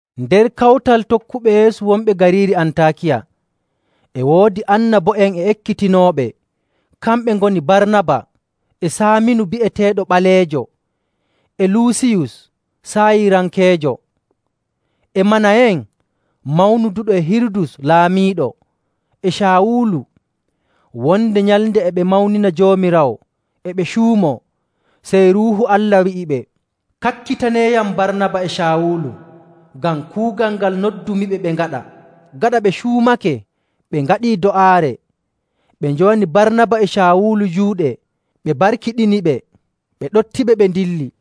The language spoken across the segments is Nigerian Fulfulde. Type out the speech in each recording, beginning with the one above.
Nder kawtal tokkuɓe Yeesu wonɓe gariiri Antaakiya e woodi annabo'en e ekkitinooɓe, kamɓe ngoni Barnaba e Saaminu bi'eteeɗo Ɓaleejo, e Luusiyus Saayirankeejo, e Manayen mawnuduɗo e Hirudus laamiiɗo, e Caawulu. Wonde nyalnde e ɓe mawnina Joomiraawo e ɓe cuumoo, sey Ruuhu Allah wi'iɓe, “Kakkitaneeyam Barnaba e Caawulu ngam kuugal ngal noddumiɓe ɓe ngaɗa.” Gaɗa ɓe cuumake ɓe ngaɗii do'aare, ɓe njowani Barnaba e Caawulu juuɗe ɓe mbarkiɗiniɓe, ɓe ɗoftiɓe ɓe ndilli.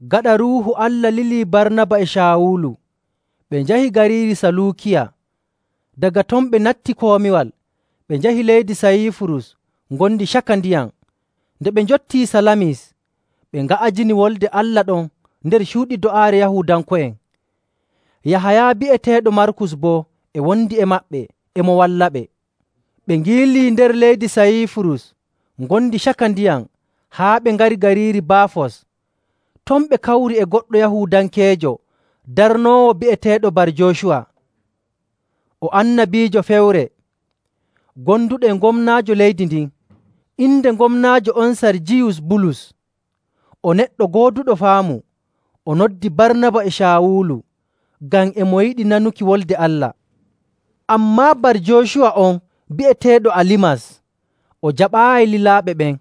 Gaɗa Ruuhu Allah lilii Barnaba e Caawulu, ɓe njahi gariiri Saluukiya, daga ton ɓe natti komiwal ɓe njahi leydi Sayiifurus ngondi caka ndiyam. Nde ɓe njottii Salamis, ɓe nga'ajini Wolde Allah ɗon nder cuuɗi do'aare Yahuudanko'en. Yahaya bi'eteeɗo Markus boo e wondi e maɓɓe, e mo wallaɓe. Ɓe ngiilii nder leydi Sayiifurus ngondi caka ndiyam haa ɓe ngari gariiri Baafos. Ton ɓe kawri e goɗɗo Yahuudankeejo darnoowo bi'eteeɗo Bar‑Joocuwa. O annabiijo fewre, gonduɗo e gomnaajo leydi ndin. Inde gomnaajo on Sarjiyus Bulus, o neɗɗo gooduɗo faamu. O noddi Barnaba e Caawulu ngam e mo yiɗi nanuki Wolde Allah. Ammaa Bar‑Joocuwa on bi'eteeɗo Alimas, o jaɓaayi lilaaɓe ɓen.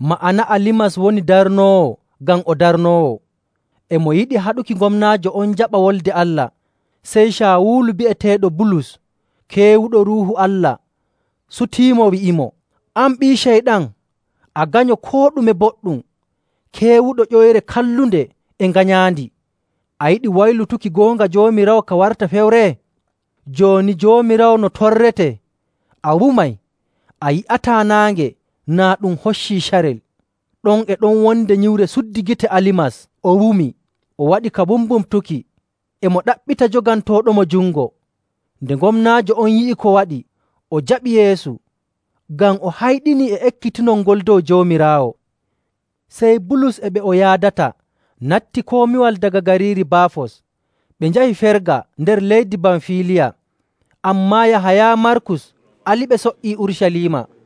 (Ma'ana Alimas woni darnoowo ngam o darnoowo.) E mo yiɗi haɗuki gomnaajo on jaɓa Wolde Allah. Sey Caawulu, bi'eteeɗo Bulus, keewuɗo Ruuhu Allah, sutiimo, wi'imo, “An ɓii Ceyɗan, a ganyo koo ɗume boɗɗum, keewuɗo ƴoyre kallunde e nganyaandi. A yiɗi waylutuki goonga Joomiraawo ka warta fewre? Jooni Joomiraawo no torrete, a wumay, a yi'ataa naange naa ɗum hoccii carel.” Ɗon e ɗon wonde nyiwre suddi gite Alimas o wumi. O waɗi ka mbumbumtuki, e mo ɗaɓɓita jogantooɗomo jungo. Nde gomnaajo on yi'i ko waɗi, o jaɓi Yeesu, ngam o hayɗinii e ekkitinol ngol dow Joomiraawo. Sey Bulus e ɓe o yaadata natti komiwal daga gariiri Baafos, ɓe njahi Ferga nder leydi Bamfiiliya. Ammaa Yahaya Markus aliɓe so''ii Urucaliima.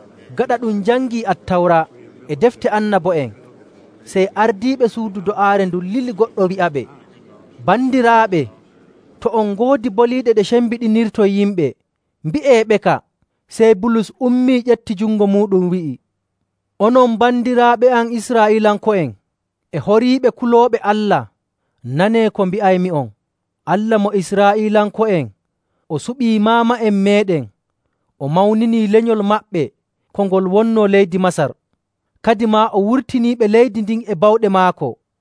Gaɗa ɗum jangii Attawra e defte annabo'en, sey ardiiɓe suudu do'aare ndun lili goɗɗo wi'aɓe, “Bandiraaɓe, to on ngoodi boliiɗe ɗe cembiɗinirton yimɓe, mbi'eeɓeka.” Sey Bulus ummii, ƴefti jungo muuɗum, wi'i, “Onon bandiraaɓe am Israa'iilanko'en e horiiɓe kulooɓe Allah, nanee ko mbi'aymi'on. Allah mo Israa'iilanko'en o suɓii maama'en meeɗen, o mawninii lenyol maɓɓe ko ngol wonnoo leydi Masar, kadimaa o wurtiniiɓe leydi ndin e bawɗe maako..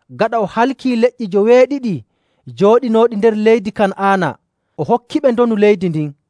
Gaɗa o halkii leƴƴi joweeɗiɗi jooɗinooɗi nder leydi Kan'aana, o hokkiɓe ndonu leydi ndin..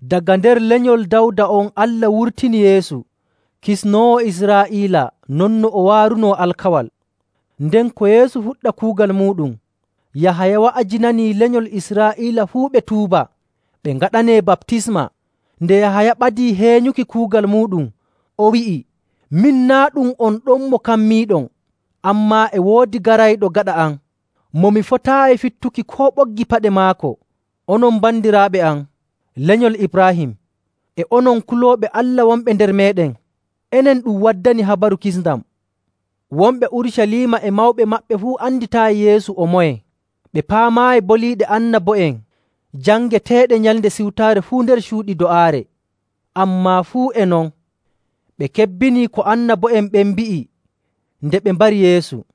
Daga nder lenyol Dawda on Allah wurtini Yeesu, kisnoowo Israa'iila non no o waarunoo alkawal. Nden ko Yeesu fuɗɗa kuugal muuɗum, Yahaya wa'ajinanii lenyol Israa'iila fuu ɓe tuuba, ɓe ngaɗanee baptisma.. Nde Yahaya ɓadii heenyuki kuugal muuɗum, o wi'i, ‘Min naa' ɗum on ɗon mo kammiiɗon. Ammaa e woodi garayɗo gaɗa am, mo mi fotaayi fittuki koo ɓoggi paɗe maako.’. “Onon bandiraaɓe am, lenyol Ibraahim, e onon kulooɓe Allah wonɓe nder meeɗen! Enen ɗum waddani habaru kisndam. Wonɓe Urucaliima e mawɓe maɓɓe fuu anditaayi Yeesu o moye. Ɓe paamaayi boliiɗe annabo'en jangeteeɗe Nyalnde Siwtaare fuu nder cuuɗi do'aare. Ammaa fuu e non, ɓe kebbini ko annabo'en ɓen mbi'i nde ɓe mbari Yeesu.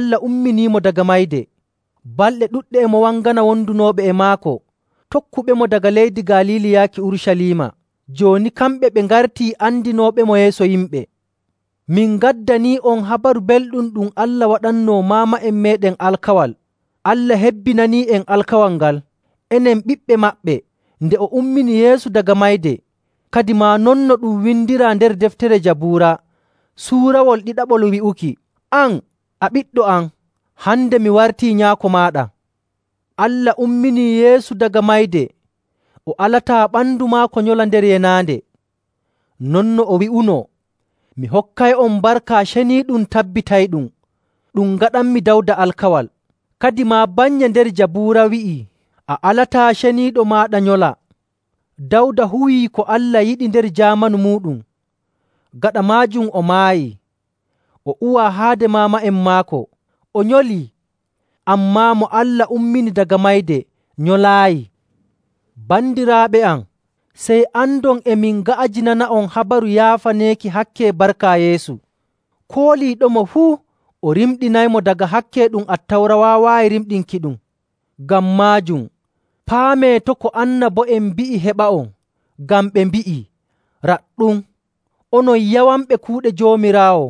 Ammaa Allah umminiimo daga mayde. Balɗe ɗuɗɗe e mo wangana wondunooɓe e maako, tokkuɓemo daga leydi Galiili yaaki Urucaliima. Jooni kamɓe ɓe ngartii andinooɓemo yeeso yimɓe.. Min ngaddanii'on Habaru Belɗum ɗum Allah waɗannoo maama'en meeɗen alkawal.. Allah hebbinanii'en alkawal ngal, enen ɓiɓɓe maɓɓe, nde o ummini Yeesu daga mayde. Kadimaa non no ɗum windiraa nder deftere Jabuura suurawol ɗiɗaɓol wi'uki, ‘An, a ɓiɗɗo am, hande mi wartii nyaako maaɗa.’ Allah umminii Yeesu daga mayde o alataa ɓandu maako nyola nder yenaande. Non no o wi'unoo: ‘Mi hokkay'on barka ceniiɗum tabbitayɗum, ɗum ngaɗanmi Dawda alkawal.’. Kadimaa bannye nder Jabuura wi'i, ‘A alataa Ceniiɗo maaɗa nyola.’. Dawda huwii ko Allah yiɗi nder jaamanu muuɗum. Gaɗa maajum o maayi, o uwaa haade maama'en maako, o nyolii. Ammaa mo Allah ummini daga mayde nyolaayi. Bandiraaɓe am, sey andon e min nga'ajinana'on habaru yaafaneeki hakke barka Yeesu. Kooliiɗomo fuu, o rimɗinaymo daga hakke ɗum Attawra waawaayi rimɗinkiɗum. Ngam maajum, paamee to' ko annabo'en mbi'i heɓa'on. Ngam ɓe mbi'ii, ‘Raɗɗum, onon yawanɓe kuuɗe Joomiraawo,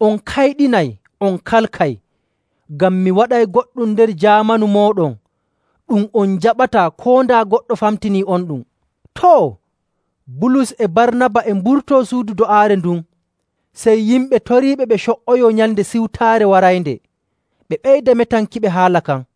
on kayɗinay, on kalkay! Ngam mi waɗay goɗɗum nder jaamanu mooɗon, ɗum on njaɓataa koo daa goɗɗo famtinii'onɗum!’”. Too, Bulus e Barnaba e mburtoo suudu do'aare ndun, sey yimɓe toriiɓe ɓe co''oyoo Nyalnde Siwtaare waraynde, ɓe ɓeyda metankiɓe haala kan.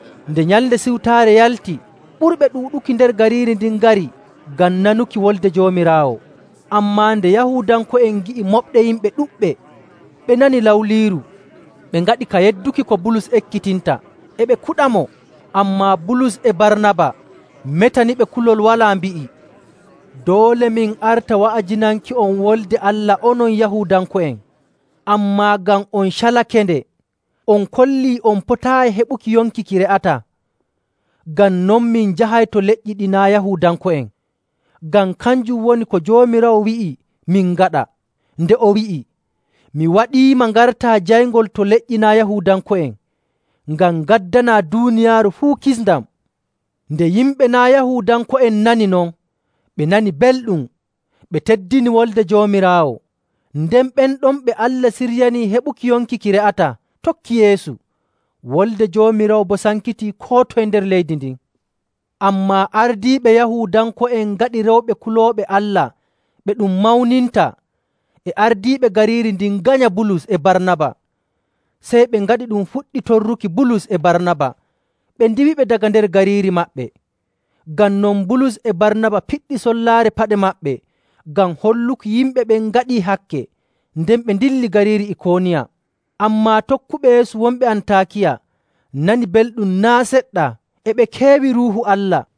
Nde Nyalnde Siwtaare yalti, ɓurɓe ɗuuɗuki nder gariiri ndin ngari ngam nanuki Wolde Joomiraawo. Ammaa nde Yahuudanko'en ngi'i moɓde yimɓe ɗuɗɓe, ɓe nani lawliiru, ɓe ngaɗi ka yedduki ko Bulus ekkitinta, e ɓe kuɗamo. Ammaa Bulus e Barnaba metaniɓe kulol walaa mbi'i, “Doole min arta wa'ajinanki'on Wolde Allah onon Yahuudanko'en. Ammaa ngam on calakende, on kollii on potaayi heɓuki yonki ki re'ataa. Ngam non min njahay to leƴƴi ɗi naa' Yahuudanko'en. Ngam kanjum woni ko Joomiraawo wi'i min ngaɗa, nde o wi'i, ‘Mi waɗiima ngartaa jayngol to leƴƴi naa' Yahuudanko'en, ngam ngaddanaa duuniyaaru fuu kisndam.’”. Nde yimɓe naa' Yahuudanko'en nani non, ɓe nani belɗum, ɓe teddini Wolde Joomiraawo. Nden ɓen ɗon ɓe Allah siryanii heɓuki yonki ki re'ataa tokki Yeesu. Wolde Joomiraawo boo sankitii koo toye nder leydi ndin. Ammaa ardiiɓe Yahuudanko'en ngaɗi rewɓe kulooɓe Allah ɓe ɗum mawninta, e ardiiɓe gariiri ndin nganya Bulus e Barnaba, sey ɓe ngaɗi ɗum fuɗɗi torruki Bulus e Barnaba, ɓe ndiiwiɓe daga nder gariiri maɓɓe. Ngam non Bulus e Barnaba piɗɗi sollaare paɗe maɓɓe ngam holluki yimɓe ɓen ngaɗii hakke, nden ɓe ndilli gariiri Ikooniya.. Ammaa tokkuɓe Yeesu wonɓe Antaakiya nani belɗum naa' seɗɗa, e ɓe keewi Ruuhu Allah.